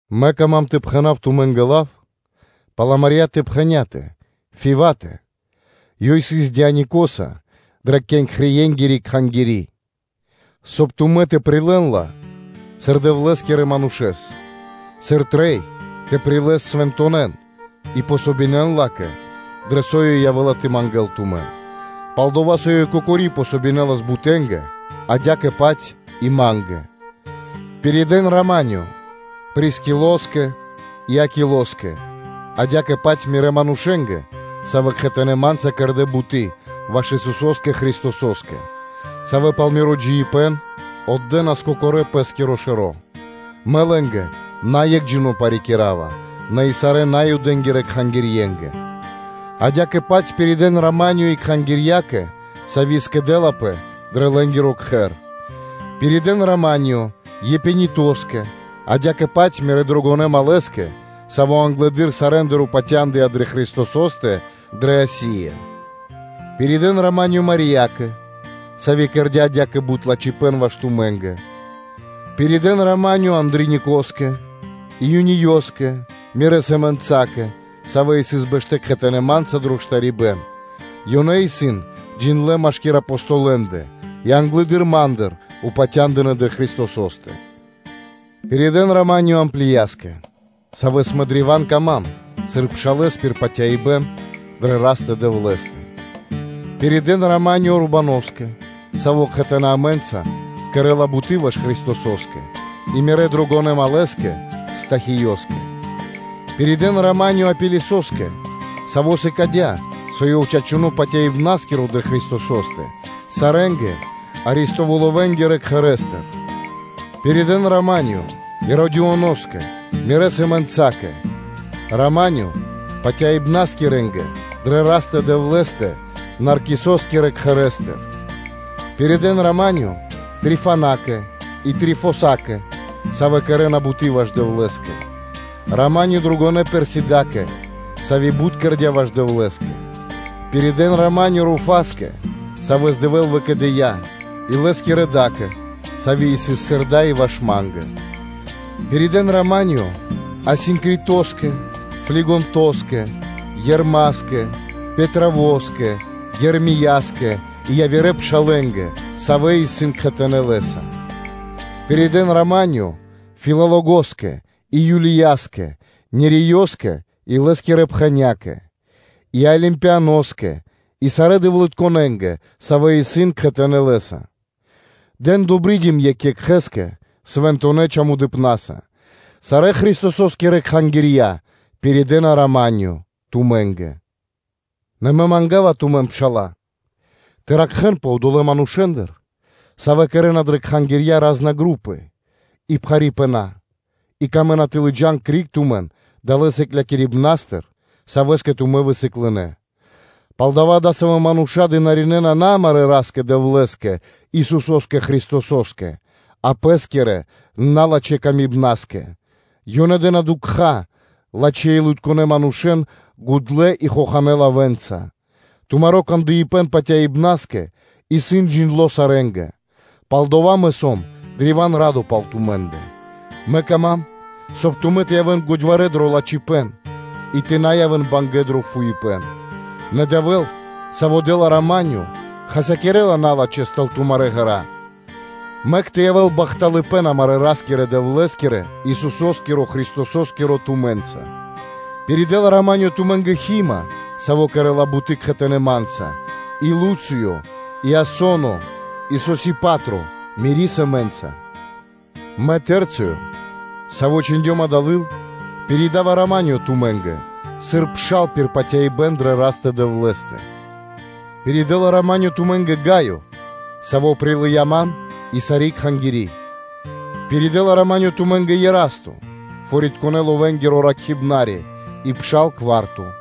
Мэ кама́м тэ пхэна́в тумэ́нгэ лав пал амарьятэ пхэнятэ Фиватэ, ёй исын диакониса дрэ Кенхреенгири кхангири́; соб (кай) тумэ́ тэ прилэ́н ла сыр Дэвлэ́скирья манушня́, сыр трэй тэ прилэс свэнтонэн, и помогинэн ла́кэ, дрэ со ёй явэ́ла тэ мангэ́л тумэн, пал-дова́ со ёй кокори помогинэлас бутэнгэ, адя́кэ-паць и ма́нгэ. Пиридэ́н “рама́нё” (миро) Прискилоскэ и Акилоскэ, адя́кэ-паць мирэ́ манушэ́нгэ, савэ́ кхэтанэ́ ма́нца кэрдэ́ буты́ ваш Исусо́скэ Христосо́скэ, савэ́ пал миро джиибэ́н отдэнас кокорэ́ пэ́скиро шэро́; мэ парикирава лэ́нгэ наекхджино нэ и сарэ́ Наюдэнгирэ кхангирья, адя́кэ-паць пиридэ́н “рама́нё” и кхангирьякэ, сави́ скэдэлапэ дрэ лэ́нгиро кхэр. Пиридэ́н “рама́нё” Епенетоскэ, адя́кэ-паць мирэ́ дрогонэ́ малэ́скэ, саво́ англэды́р сарэ́ндыр упатяндыя дрэ Христосо́стэ дрэ Асия. Пиридэ́н “рама́нё” Мариякэ, сави́ кэрдя́ адя́кэ бут лачхипэ́н ваш тумэ́нгэ. Пиридэ́н “рама́нё” Андроникоскэ и Юниёскэ, мирэ́ сэмэнцакэ, савэ́ сыс бэштэ́ кхэтанэ́ ма́нца дро штарибэ́н; ёнэ исын джиндлэ́ машки́р Апостолэндэ и англэды́р ма́ндыр упатя́ндынэ дрэ Христосо́стэ. Пиридэ́н “рама́нё” Амплияскэ, саво́ исын древа́н дро́го ма́нгэ сыр пшал пир патяибэ́н дрэ Растэ-Дэвлэ́стэ. Пиридэ́н “рама́нё” Урбаноскэ, саво́ кхэтанэ́ амэ́нца кэрэ́ла буты́ ваш Христосо́скэ, и мирэ́ дрогонэ́ малэ́скэ Стахиёскэ. Пиридэ́н “рама́нё” Апелесоскэ, саво́ сыкадя́, со ёв чачуно́ патяибнаскиро дрэ Христосо́стэ, сарэ́нгэ Аристовулоскирэ кхэрэ́стыр. Пиридэ́н “рама́нё” Иродионоскэ, мирэ́ сэмэнцакэ, “рама́нё” патяибнаскирэнгэ дрэ Растэ-Дэвлэ́стэ Наркисоскирэ кхэрэ́стыр. Пиридэ́н “рама́нё” Трифенакэ и Трифосакэ, савэ́ кэрэ́на буты́ ваш Дэвлэ́скэ. “Рама́нё” дрогонэ́ Персидакэ, сави́ бут кэрдя́ ваш Дэвлэ́скэ. Пиридэ́н “рама́нё” Руфаскэ, савэ́с Дэвэ́л выкэдыя́, и лэ́скирэ да́кэ, сави́ сыс сыр дай и ваш ма́нгэ. Пиридэ́н “рама́нё” Асинкритоскэ, Флигонтоскэ, Ермаскэ, Патровоскэ, Ермияскэ и явирэ пшалэ́нгэ, савэ́ исын кхэтанэ́ лэ́са. Пиридэ́н “рама́нё” Филологоскэ и Юлияскэ, Ниреёскэ и лэ́скирэ пхэнякэ, и Олимпаноскэ и сарэ́ дэвлытконэнгэ, савэ́ исын кхэтанэ́ Лэ́са. Дэн “добридим” екх екхэ́скэ Свэнтонэ́ чамудыпнаса. Сарэ́ Христосо́скирэ кхангирья пиридэна “рама́нё” тумэ́нгэ. Нэ мэ манга́ва тумэн, пшала́лэ, тэ ракхэ́нпэ одолэ́ манушэ́ндыр, савэ́ кэрэ́на дрэ кхангирья роскэрибэна и пхарипэна, и камэ́на тэ лыджа́н криг тумэн далэ́ сыкляибнастыр, савэ́скэ тумэ́ высыклынэ. Палдава́ адасавэ́ мануша́ дынаринэна на амарэ́ Ра́скэ-Дэвлэ́скэ, Исусо́скэ Христосо́скэ, а пэ́скирэ налачхэ́ камибнаскэ; ёнэ хахавэ́на (дэ́на дукха́) лачхэ́-илытконэ манушэ́н гудлэ́ и хоханэ́ лавэ́нца. Тумаро кандыпэн патяибнаскэ исын джиндло́ сарэ́нгэ; палдава́ мэ сом древа́н радо пал тумэ́ндэ, мэ кама́м, соб (кай) тумэ́ тэ явэ́н годьварэ́ дро лачхипэ́н и тэ на явэ́н бангэ́ дро фуипэ́н. Нэ Дэвэ́л, Саво́ дэ́ла рама́нё, хасякирэ́ла налачхэ́с тэл тумарэ́ ґэра́. Мэк тэ явэ́л бахталыпэ́н амарэ́ Ра́скирэ-Дэвлэ́скирэ, Исусо́скиро Христосо́скиро тумэ́нца! Ами́нь. Пиридэла “рама́нё” тумэ́нгэ Хима (Тимофеё), саво́ кэрэ́ла буты́ кхэтанэ́ ма́нца, и Луцыё, Иасоно, и Сосипатро, мири́ сэмэ́нца. Мэ, Цэрцыё, саво́ чхиндём дава́ лыл, пиридава “рама́нё” тумэ́нгэ, сыр пшал пир патяибэ́н дрэ Растэ-Дэвлэ́стэ. Пиридэла “рама́нё” тумэ́нгэ Гаё, саво́ прилыя́ ман и сари́ кхангири́. Пиридэла “рама́нё” тумэ́нгэ Ерасто, ракхибна́ри пэ фори́тко тыкнори́ (сокровишчы́тко) и пшал Кварто.